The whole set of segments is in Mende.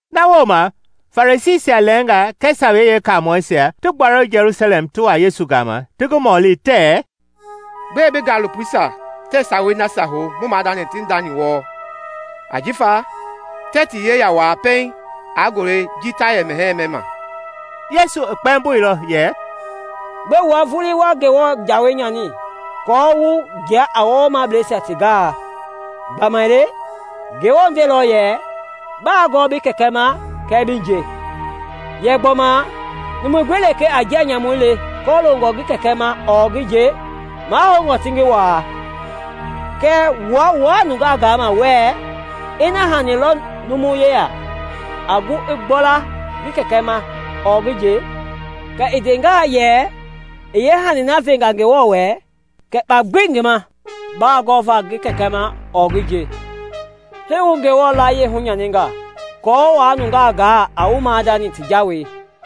Na wooma Farisiisia lɛɛnga kɛɛ Sawei Yeekaamɔisia ti gbuailɔ Jelusalɛm ti wa Yesu gama ti ngi mɔli tɛɛ, “Gbɛe bi gaalopoisia tɛɛ sawei nasia hou mu maadani ti ndani wɔɔ? Ajifa tɛɛ ti yeya wua pɛiŋ a nguayii ji ta yɛ mɛhɛɛ mɛma.” Yesu i kpɛmboilɔ yɛ, “Gbɛe wua vulii wa Ngewɔ jawei nyani aako wu jia a wɔwɔmableisia ti gaai? Gbamaile Ngewɔ ndeilɔ yɛ, ‘Baa gɔɔ bi kɛkɛ ma kɛɛ bi nje,’ yɛ gbɔma, ‘Numu gbi lekee a njia nyamu le kɔloongɔ ngi kɛkɛ ma ɔɔ ngi nje, mahoungɔ ti ngi waa.’ Kɛɛ wua wuaa nungaa gama wɛɛ, Ina hani lɔ numu yeya a gu a gbɔla la ngi kɛkɛ ma ɔɔ ngi nje, kɛɛ i nde yɛ ‘i yeehani na venga Ngewɔ wɛ,’ kɛ kpa gbi ii yaa ngi ma baa gɔvaa ngi kɛkɛ ma ɔɔ ngi nje. Hii wu Ngewɔ layie hunyaninga aako wa nungaa gaa a wu maadani ti jawei.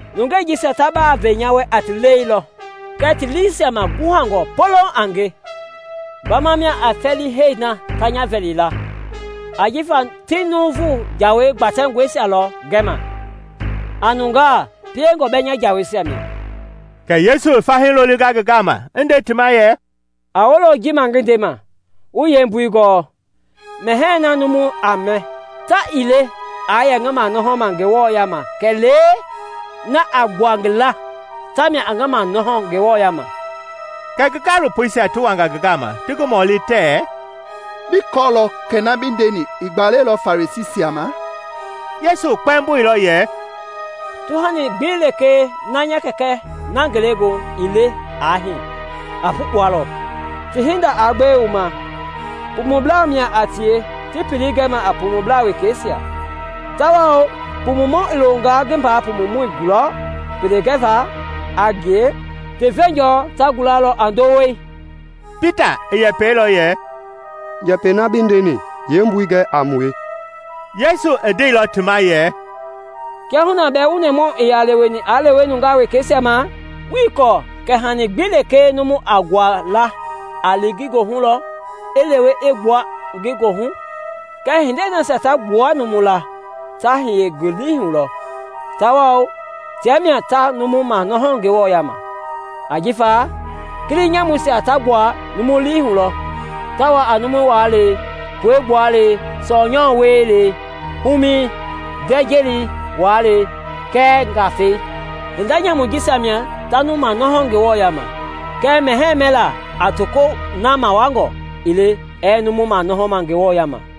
‘Nungei jisia ta baa ve nya wɛ a ti lɛi lɔ kɛɛ ti liisia maguhangɔ poloŋ a nge. Gbama mia a fɛlii hɛi na ta nya vɛli la ajifa ti nuuvu jawa gbatɛngɔisia lɔ gɛma a nungaa piengɔ bɛɛ nya jaweisia mia.’” Kɛ Yesu i fahii lolinga ngi gama i nde ti ma yɛ, “A wolo ji ma ngi ndema, wu yeembui gɔɔ. Mɛhɛɛi na numu a mɛ ta ii le aa yɛ ngi manɔhɔma Ngewɔ yaama kɛlee na a gbua ngi laa, tamia a numu manɔhɔ Ngewɔ yaama.” Kɛ ngi gaalopoisia ti wanga ngi gama ti ngi mɔli tɛɛ, “Bi kɔɔlɔ kɛ na bi ndeni i gbalɛilɔ Farisiisia ma?” Yesu kpɛmboilɔ yɛ, “Tuhani gbi lekee nya Kɛkɛ na Ngelegoohu ii le aa hii, a pukpualɔ. Ti hinda aa gbewe wu ma! Pumublaa mia a tie ti pelei gɛma a pumublaa wekeisia, tawao pumumɔ i longaa ngi mbaa pumumɔ gulɔ pele gɛva a ngie, ti veenjɔ ta gulalɔ a ndowei.” Pita i yɛpɛilɔ yɛ; “Njɛpɛi na bi ndeni yeembui gɛ a mue.” Yesu i ndeilɔ ti ma yɛ, “Kiahuna bɛɛ wu nɛmahu ii yaa leweni aa lewee nungaa wekeisia ma? Wuii kɔɔ kɛ hani gbi lekee numu a nguaa laa a li ngi goi hu lɔ, i lewe i gbua ngi goohu? Kɛɛ hindei nasia ta gbua numu laa ta hiye numu lii hu lɔ, tawao tia mia ta numu manɔhɔ Ngewɔ yaama. Ajifa kili nyamuisia ta gbua numu lii hu lɔ ta wa a numu waalɛi, pue gbualei, sɔɔ nyamui wielei, humɛi, ndɛ-jeli wuaalei kɛɛ njafɛi. Hinda nyamui jisia mia ta numu manɔhɔ Ngewɔ yaama; kɛɛ mɛhɛɛ mɛlaa a tokoi na mawuangɔ ii le ɛɛ numu manɔhɔ Ngewɔ yaama.”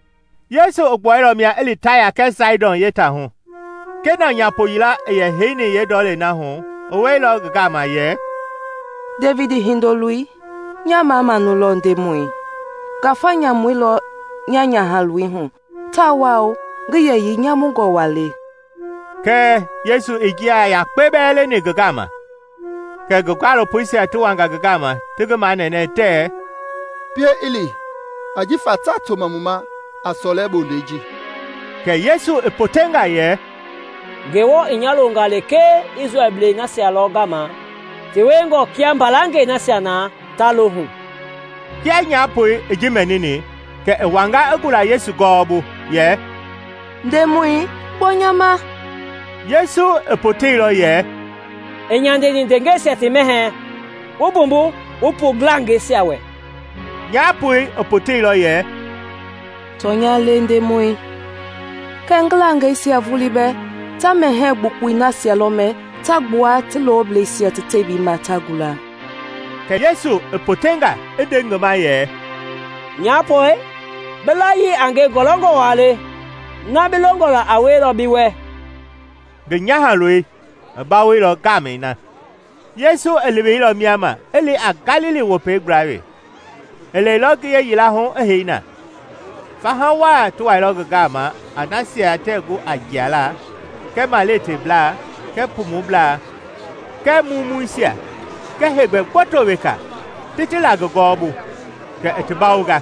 Yesu i gbuailɔ mia i li Taya kɛɛ Saidɔn yeetatei hu. Kenaan nyaapo yila i yɛ heini yeendɔlɛi na hu i wɛilɔ ngi gama yɛ, “Devidi Hindoloi, nya mamamau lɔ, Ndemɔi! Ngafa nyamu lɔ nya nyahaloi hu tawao ngi yɛyii nyamungɔ waa le.” Kɛɛ Yesu ii njia yakpe bɛɛ lɛni ngi gama. Kɛ ngi gaalopoisia ti wanga ngi gama ti ngi manɛnɛ tɛɛ, “Pie i li, ajifa taa toma mu ma a sɔlɛ bondei ji!” Kɛ Yesu i potenga yɛ, “Ngewɔ i nya loonga lekee Isrɛlblei nasia lɔ gama ti wiengɔ kia mbalangɛi nasia na ta lohu.” Kia nyaapoi i ji mɛnini kɛ i wanga i gula Yesu gɔwɔbu yɛ, “Ndemɔi, gbɔ nya ma!” Yesu i poteilɔ yɛ, “Ii nyandeni ndengeisia ti mɛhɛɛ wumbuva bi pu ngilangɛisia wɛ.” Nyaapoi i poteilɔ yɛ, “Tɔnya le, Ndemɔi, kɛɛ ngilangɛisia vulii bɛɛ ta mɛhɛɛ gbukpui nasia lɔ mɛ ta gbua ti loblɛisia ti tebii ma ta gula.” Kɛ Yesu i potenga i nde ngi ma yɛ, “Nyapoi, bi layii a nge ngɔlɔngɔ waa le! Na bi longɔ la a wielɔ bi wɛ.” Ngi nyahaloi i bawoilɔ ngaamɛi na. Yesu i leweilɔ mia ma i li a Galili Wopei gbla wee. I lɛilɔ ngiye yila hu i hei na. Faha waa ti wailɔ ngi gama a nasia tɛɛ gu a jialaa kɛɛ maleteblaa kɛɛ pumublaa kɛɛ mumuisia kɛɛ heegbɛ gboto weka ti ti la ngi gɔwɔbu, kɛ i ti bawonga.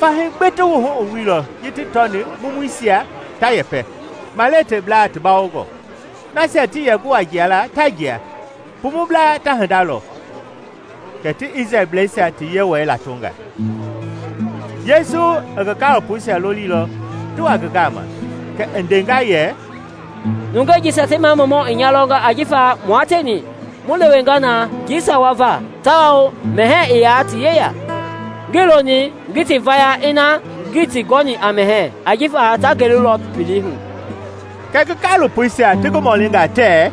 Fahii gbi ti wuhu i wuilɔ ji ti tɔni mumuisia ta yɛpɛ, maleteblaa ti bawongɔ, nasia tii yɛ gu a jialaa ta jia, pumublaa ta hinda lɔ; kɛ ti Isrɛlblɛisia ti Yewɔɛi latonga. Yesu i ngi gaalopoisia lolilɔ ti wa ngi gama, kɛ i ndenga yɛ, “Nungei jisia ti mamamau i nya lɔnga ajifa mua tieni mu lewenga na njii sawa va tawao mɛhɛɛ ii yaa ti yeya. Ngii loni ngi ti vaya ina ngii ti gɔni a mɛhɛɛ ajifa ta gelulɔ pelei hu.” Kɛ ngi gaalopoisia ti ngi mɔlinga tɛɛ,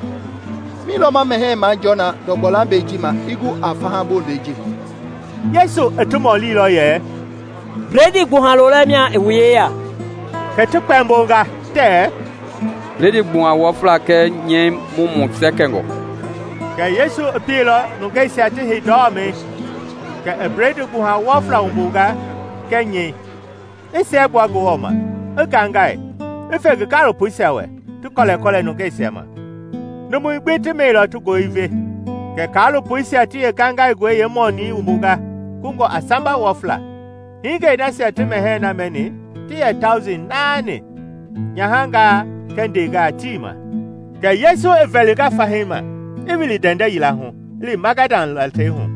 “Mi lɔ ma mɛhɛɛ jɔɔ na ndɔgbɔ lambɛi ji ma i gu a faha bondei ji?” Yesu i ti mɔlilɔ yɛ, “Bledii gbuha lolɛ mia i wu yeya?” Kɛ ti kpɛmbonga tɛɛ, “Bledii gbuha wɔfla kɛɛ nyɛɛ mumu sɛkɛngɔ.” Kɛ Yesu i pieilɔ nungeisia ti hei ndɔmɛi. Kɛ i bledii gbuha wɔfla wumbunga kɛɛ nyɛi, i siɛgbua Ngewɔ ma, i ngaingai, i fe ngi gaalopoisia wɛ, ti kɔlɛkɔlɛ nungeisia ma. Numui gbi ti mɛilɔ ti goi i ve. Kɛ kaalopoisia ti yeengaingaingɔi yeemɔnii wumbunga kungɔ a samba wɔfla. Hingei nasia ti mɛhɛɛ na mɛni ti yɛ tauji naani, nyahangaa kɛɛ ndengaa tii ma. Kɛ Yesu i vɛlinga fahii ma, i wili ndɛndɛ yila hu, i li Magadan latei hu.